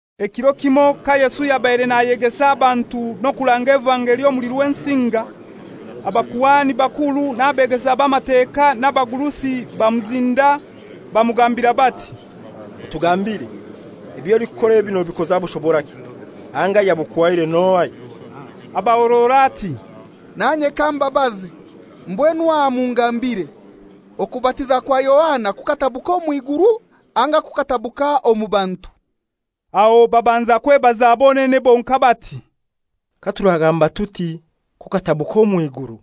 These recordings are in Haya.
Ekiro kimoi ka Yesu yabaire nayegesa abantu n'okuranga evangeli omuli Rwensinga, abakuhani bakuru n'abeegesa b'Amateka n'abagurusi bamuzinda bamugambira bati, «Otugambire, eby'olikukora ebi nobikoza bushoboraki, anga ayabukuhaire n'ohai?» Abahorora ati, «Nanye kambabaze; mbwenu aha mungambire, Okubatiza kwa Yohana gukatabuka omw'iguru anga gukatabuka omu bantu?» Aho babanza kwebaza bonene bonkai bati, «Katuragamba tuti, ‹Kukatabuka omw'iguru,›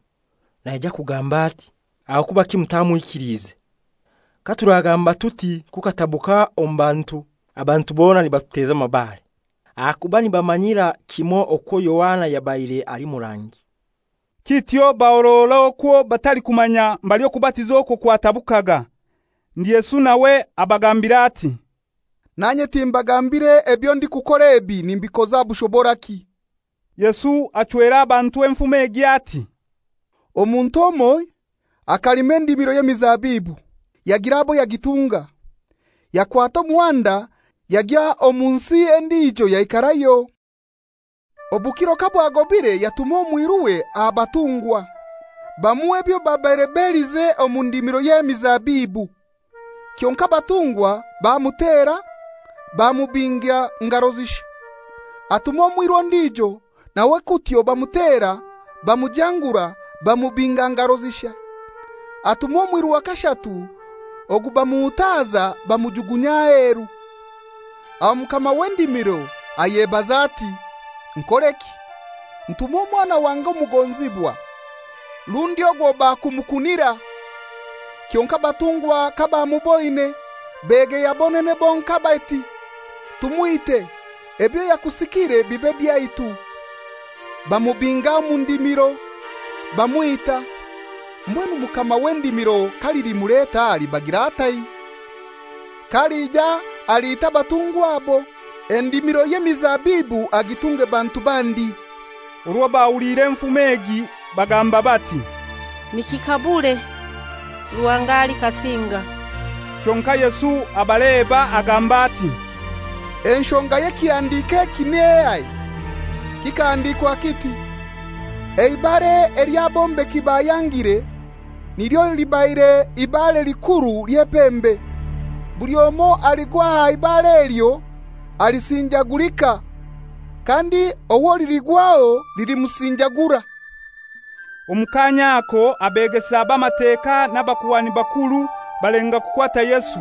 naija kugamba ati, ‹Aho kubaki mutamwikiliize?› Katuragamba tuti, ‹Kukatabuka omu bantu,› abantu bona nibatuteza amabare; ahakuba nibamanyira kimoi okwo Yohana yabaire ali murangi.» Kityo bahorora okwo batalikumanya mbali okubatiza okwo kwatabukaga. Ndi Yesu nawe abagambira ati, «Nanye timbagambire ebyo ndikukora ebi nimbikoza bushoboraki.» Yesu achwera abantu enfumo egi ati, «Omuntu omoi akalima endimiro y'emizabibu; yagira abo yagitunga, yakwata omuhanda yagya omu nsi endijo yaikarayo. Obukiro kabwagobire yatuma omwiruwe aha batungwa, bamuhe ebyo babaire belize omu ndimiro y'emizabibu. Kyonkai abatungwa bamutera, bamubinga ngaro zishai. Atuma omwiru ondijo, nawe kutyo bamutera, bamujangura, bamubinga ngaro zishai. Atuma omwiru wa kashatu, ogu bamuhutaza bamujugunya aheru. Aho mukama w'endimiro ayebaza ati, ‹Nkoreki? Ntume omwana wange omugonzibwa, rundi ogwo bakumukunira.› Kyonkai abatungwa kabamuboine, begeya bonene bonkai bati, ‹Tumwite, ebyo yakusikire bibe byaitu.› Bamubinga omu ndimiro, bamwita. Mbwenu mukama w'endimiro kalilimuleta alibagira atai? K'alija aliita abatungwa abo, endimiro y'emizabibu agitunge bantu bandi.» Orwo bahuliire enfumo egi bagamba bati, «Nikikabure! Ruhanga alikasinga.» Kyonkai Yesu abaleba agamba ati, «Enshonga y'ekihandiko eki nehai? Kikahandikwa kiti, ‹Eibare ely'abombeki bayangire, nilyo libaire ibare likuru ly'epembe.› Buli omoi aligwa aha ibare elyo alisinjagulika; kandi owo liligwaho lilimusinjagura.» Omu kaanya ako abeegesa b'Amateka n'abakuhani bakuru balenga kukwata Yesu,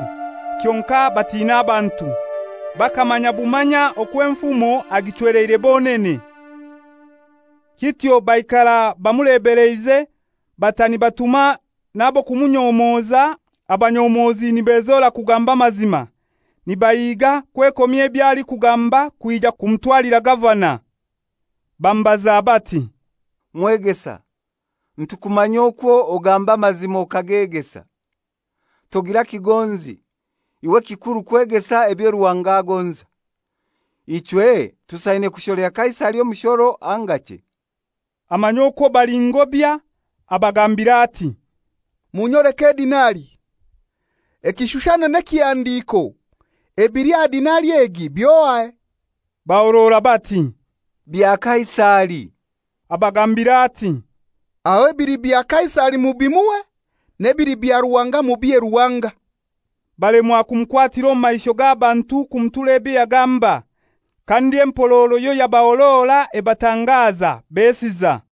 kyonkai batiina abantu. Bakamanya bumanya okwo enfumo agichweleire bonene. Kityo baikara bamulebeleize, bata nibatuma n'ab'okumunyomoza, abanyomozi nibezora kugamba amazima, nibahiga kwekomya ebyo alikugamba kwija kumutwalira gavana. Bamubaza bati, «Mwegesa, nitukumanya okwo ogamba amazima okagegesa. Togira kigonzi, iwe ekikuru kwegesa ebyo Ruhanga agonza. Ichwe tusaine kusholera Kaisari omushoro anga chei?» Amanya okwo bali ngobya, abagambira ati, «Munyoleke edinari. Ekishushani n'ekihandiiko ebili aha dinari egi by'ohai?» Bahorora bati, «Bya Kaisari.» Abagambira ati, «Aho ebili bya Kaisari mubimuhe, n'ebili bya Ruhanga mubihe Ruhanga.» Balemwa kumukwatira omu maisho g'abantu kumutura ebyo yagamba. Kandi empororo yoyabahorora ebatangaza, besiza.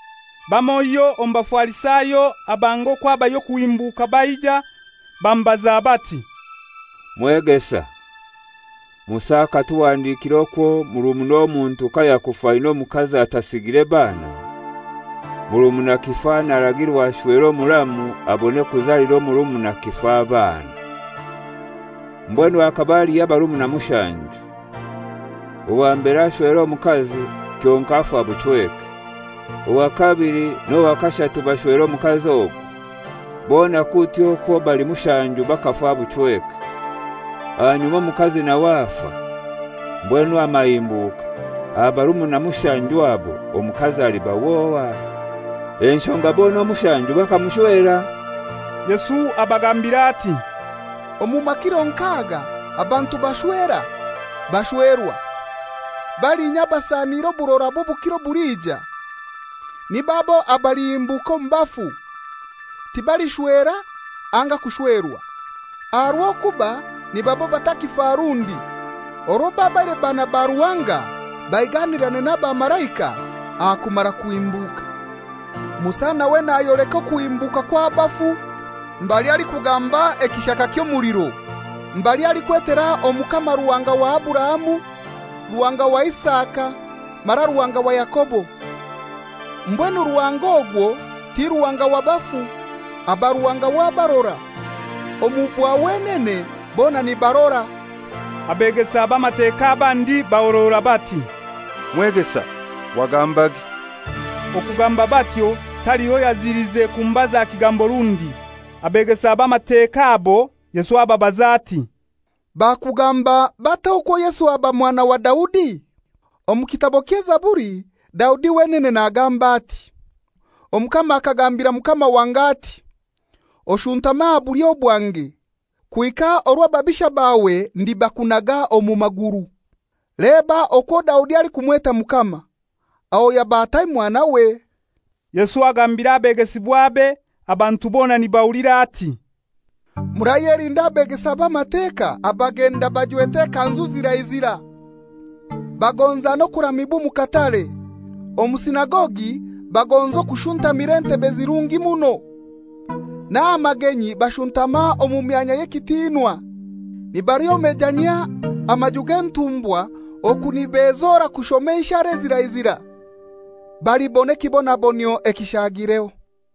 Bamoiho omu Bafarisayo abanga okwo habayo okuhimbuka baija, bamubaza bati, «Mwegesa, Musa akatuhandikira okwo murumuna omuntu kayakufa aina omukazi atasigire baana, murumuna kifa naragirwa ashwere omuramu abone kuzalira omurumuna kifa abaana. Mbwenu hakaba haliho abarumuna mushanju. Owa mbere ashwera omukazi, kyonkai afa buchweke; owa kabili n'owa kashatu bashwera omukazi ogwo; bona kutyo okwo bali mushanju bakafa buchweke. Ahanyuma omukazi nawe afa. Mbwenu aha mahimbuka, aha barumuna mushanju abo omukazi aliba w'ohai? Enshonga bona omushanju bakamushwera.» Yesu abagambira ati, «Omu makiro nk'aga abantu bashwera, bashwerwa. Balinya abasaniire oburora bw'obukiro obulija, nib'abo abalihimbuka omu bafu, tibalishwera anga kushwerwa. Aha rw'okuba nibaaba abatakifa rundi, orwo babaire baana ba Ruhanga baiganirane n'abamalaika aha kumara kuhimbuka. Musa nawe nayoleka okuhimbuka kw'abafu. Mbali alikugamba ekishaka ky'omuliro, mbali alikwetera Omukama Ruhanga wa Aburahamu, Ruhanga wa Isaka mara Ruhanga wa Yakobo. Mbwenu Ruhanga ogwo ti Ruhanga wa bafu; aba Ruhanga w'abarora; omu bwa wenene bona nibarora.» Abeegesa b'Amateka abandi bahorora bati, «Mwegesa, wagambage.» Okugamba batyo taliho yazilize kumubaza kigambo rundi. Abeegesa b'Amateka abo Yesu ababaza ati, «Bakugamba batai okwo Yesu aba mwana wa Daudi? Omu Kitabo ky'Ezaburi, Daudi wenene nagamba ati, ‹Omukama akagambira Mukama wange ati: Oshuntame aha bulyo bwange kuhika orwo ababisha bawe ndabakunaga omu maguru.› Leba okwo Daudi alikumweta Mukama; aho yaba atai mwanawe?» Yesu agambira abegesibwabe, abantu bona nibahulira ati, «Murayelinda abeegesa b'Amateka abagenda bajwete ekanzu zirai zirai, bagonza n'okuramibwa omu katare, omu sinagogi baagonza okushuntamira entebe ezirungi muno, n'aha magenyi bashuntama omu myanya y'ekitinwa, nibalyomejanyia amaju g'entumbwa oku nibezora kushoma enshara ezirai zirai. Balibona ekibonabonyio ekishagireho.»